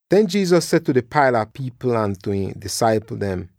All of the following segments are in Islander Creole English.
Den Jesus seh tu di paila pipl ahn tu ihn disaipl dem,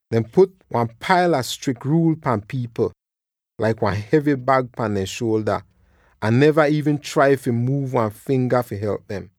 Dehn put wan paila strik ruul pan pipl, laik wan hevy bag pahn dehn shuolda, ahn neva iivn trai fi muuv wan finga fi help dem.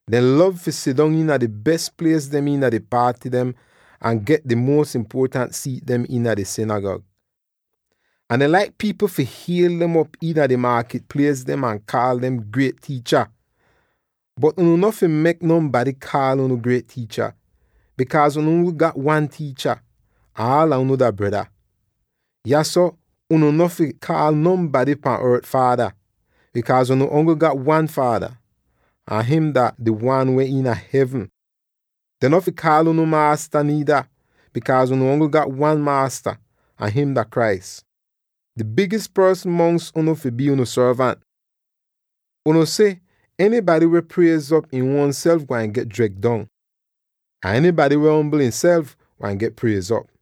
Dehn lov fi sidong iina di bes plies dem iina di paaty dem ahn get di muos impuotant siit dem iina di sinigag. Ahn dehn laik pipl fi hiel dem op iina di maakit plies dem ahn kaal dem ‘Griet Tiicha!’ Bot unu no fi mek nonbady kaal unu ‘Griet Tiicha,’ bikaaz unu ongl gat one tiicha, ahn aala unu dah breda. Yahso unu no fi kaal nonbady pahn ort ‘faada,’ bikaaz unu ongl gat one Faada, ahn him dah di wan weh iina hevn. Dehn no fi kaal unu ‘Maasta’ niida, bikaaz unu ongl gat one maasta, ahn him dah Christ! Di bigis porsn mongs unu fi bii unu sorvant. Unu si, enybady weh priez'op im uonself gwain get dreg dong. Ahn enybady weh ombl ihnself, gwain get priez'op.”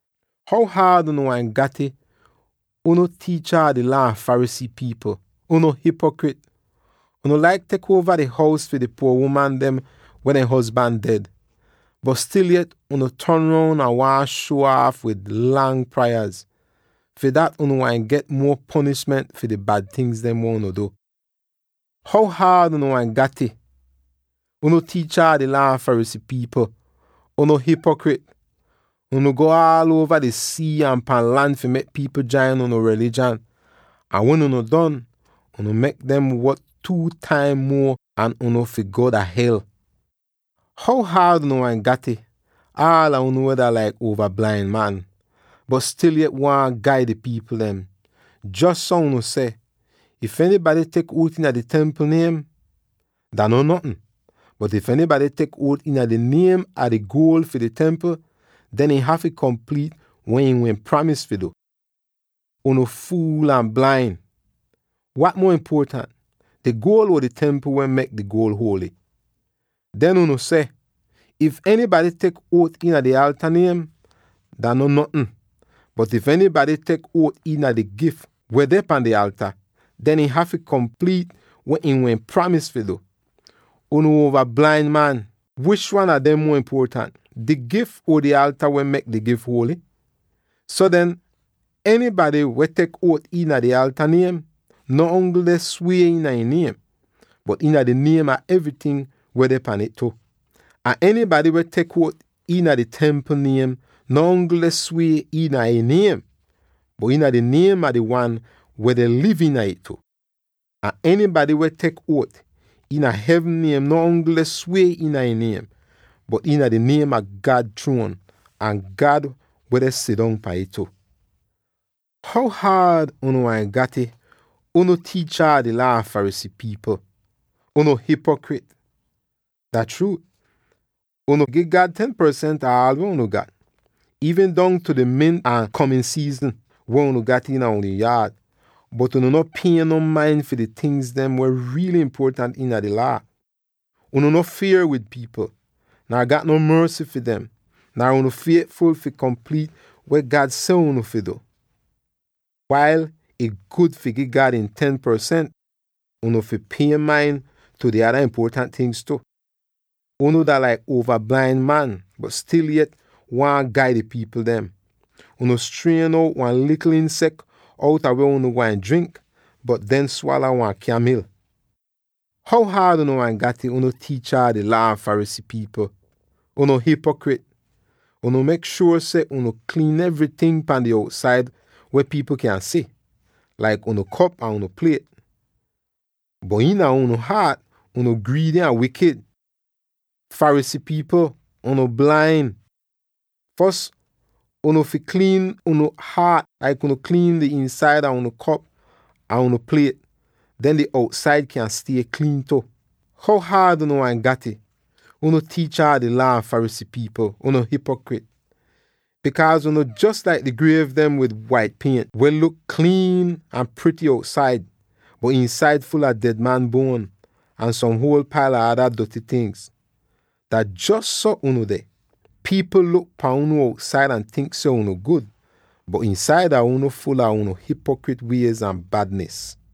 [How haad unu gwain gat'ih, unu tiicha a di Laa ahn Pharisee pipl, unu hipokrit! Unu laik tek uova di hous fi di puor uman dem weh dehn hozban ded. Bot stil yet unu ton roun ahn waahn shuo aaf wid lang prayaz. Fi dat unu gwain get muo ponishment fi di bad tingz weh unu du!] “How haad unu gwain gat'ih, unu tiicha a di Laa ahn Pharisee pipl, unu hipokrit! Unu go aal uova di sii ahn pan lan fi mek pipl jain unu rilijan, ahn wen unu don, unu mek dem wot two taim muo an unu fi go dah hel. “How haad unu gwain gat'ih, aala unu weh dah laik uova blain man, bot stil yet waahn gaid di pipl dem! Jos so unu seh, ‘If enybady tek uot iina di Templ niem, dah non notn; bot if enybady tek uot iina di niem a di guol fi di Templ, den ihn hafy kompliit weh ihn wehn pramis fi du.’ Unu fuul ahn blain! Wat muo impuotant, di guol or di Templ weh mek di guol huoly? Den unu seh, ‘If enybady tek uot iina di alta niem, dah non notn; bot if enybady tek uot iina di gif weh deh pan di alta, den ihn hafy kompliit weh ihn wehn pramis fi du.’ Unu uova blain man! Wish wan a dem muo impuotant, di gif or di alta weh mek di gif huoly? So den, enybady weh tek uot iina di alta niem no ongl deh swie iina ih niem, bot iina di niem a evryting weh deh pahn ih tu. Ahn enybady weh tek uot iina di Templ niem no ongl deh swie iina ih niem, bot iina di niem a di Wan weh deh liv iina ih tu. Ahn enybady weh tek uot iina hevn niem no ongl deh swie iina ih niem, bot iina di niem a God chruon ahn God weh deh sidong pahn ih tu. “How haad unu gwain gat'ih, unu tiicha a di Laa ahn Pharisee pipl, unu hipokrit! Dah chruut unu gi God ten porsent ah aal weh unu gat, iivn dongtu di mint ahn komin siizinin weh unu gat iina unu yaad, bot unu no pie no main fi di tingz dem weh riily impuotant iina di Laa. Unu no fier wid pipl, nar gat non morsy fi dem, nar unu fietful fi kompliit weh God seh unu fi du. Wail ih gud fi gi God ihn ten porsent, unu fi pie main tu di ada impuotant tingz tu. Unu dah laik uova blain man, bot stil yet waahn gaid di pipl dem. Unu strien out wan likl insek outa weh unu gwain drink, bot den swala wan kyamil! “How haad unu gwain gat'ih, unu tiicha a di Laa ahn Pharisee pipl, unu hipokrit! Unu mek shuor seh unu kliin evryting pan di outsaid weh pipl kyan si, laik unu kop ahn unu pliet, bot iina unu haat unu griidy ahn wikid! Pharisee pipl, unu blain! Fos unu fi kliin unu haat, laik unu kliin di iinsaida unu kop ahn unu pliet; den di outsaid kyan stie kliin tu. “How haad unu gwain gat'ih, unu tiicha a di Laa ahn Pharisee pipl, unu hipokrit! Bikaaz unu jos laik di griev dem wid wait pient, weh luk kliin ahn prity outsaid, bot iinsaid ful a ded man buon ahn som huol paila ada doty tingz. Dah jos so unu deh, pipl luk pahn unu outsaid ahn tink seh unu gud, bot iinsaida unu ful a unu hipokrit wiez ahn badnis.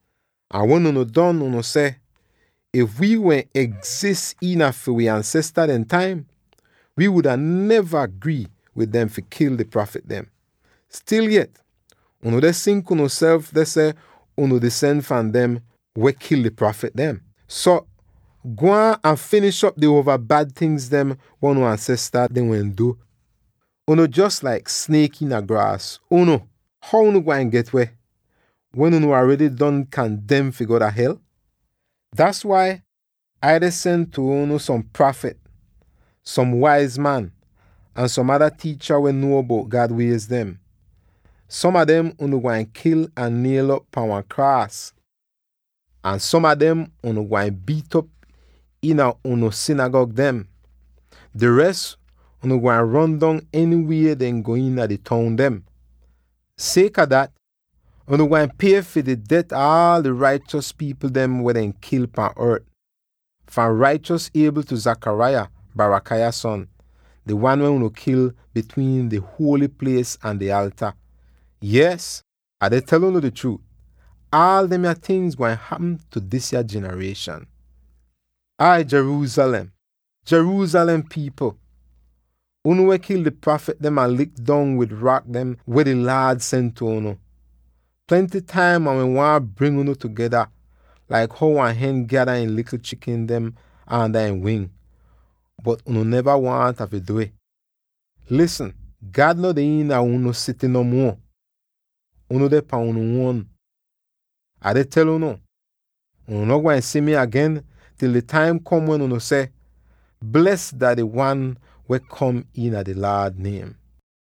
Ahn wen unu don, unu seh, ‘If wii wehn egzis iina fi wi ansesta dehn taim, wii wuda neva grii wid dem fi kil di prafit dem.’ Stil yet, unu deh sink unuself deh seh unu disen fahn dem weh wehn kil di prafit dem. So, gwaan ahn finish'op di uova bad tingz weh unu ansesta dehn wehn waahn du. Unu jos laik sniek iina graas, unu! How unu gwain get-weh, wen unu aredy don kandem fi go dah hel? “Das wai Ai deh sen tu unu som prafit, som waiz man, ahn som ada tiicha weh nuo bout God wiez dem. Som a dem unu gwain kil ahn niel'op pahn wan kraas, ahn som a dem unu gwain biit'op iina unu sinigag dem. Di res unu gwain ron dong enywie dehn go iina di toun dem. Sieka dat, unu gwain pie fi di det ah aal di raichos pipl dem weh dehn kil pahn ort, fahn raichos Abel tu Zechariah, Barachiah son, di wan weh unu kil bitwiin di huoly plies ahn di alta. Yees, Ah deh tel unu di chruut: aal demya tingz gwain hapm tu disya jinarieshan. “Ai Jerusalem, Jerusalem pipl, unu weh kil di prafit dem ahn lik dong wid rak dem weh di Laad sen tu unu! Plenty taim Ah wehn waahn bring unu tugeda, laik how wan hen gyada ihn likl chikin dem aanda ihn wing, bot unu neva waahn Ah du'ih! Lisn! God no deh iina unu sity no muo; unu deh pan unu uon. Ah deh tel unu: unu no gwain si mi agen til di taim kom wen unu seh, ‘Bles dah di Wan weh kom iina di Laad niem.’”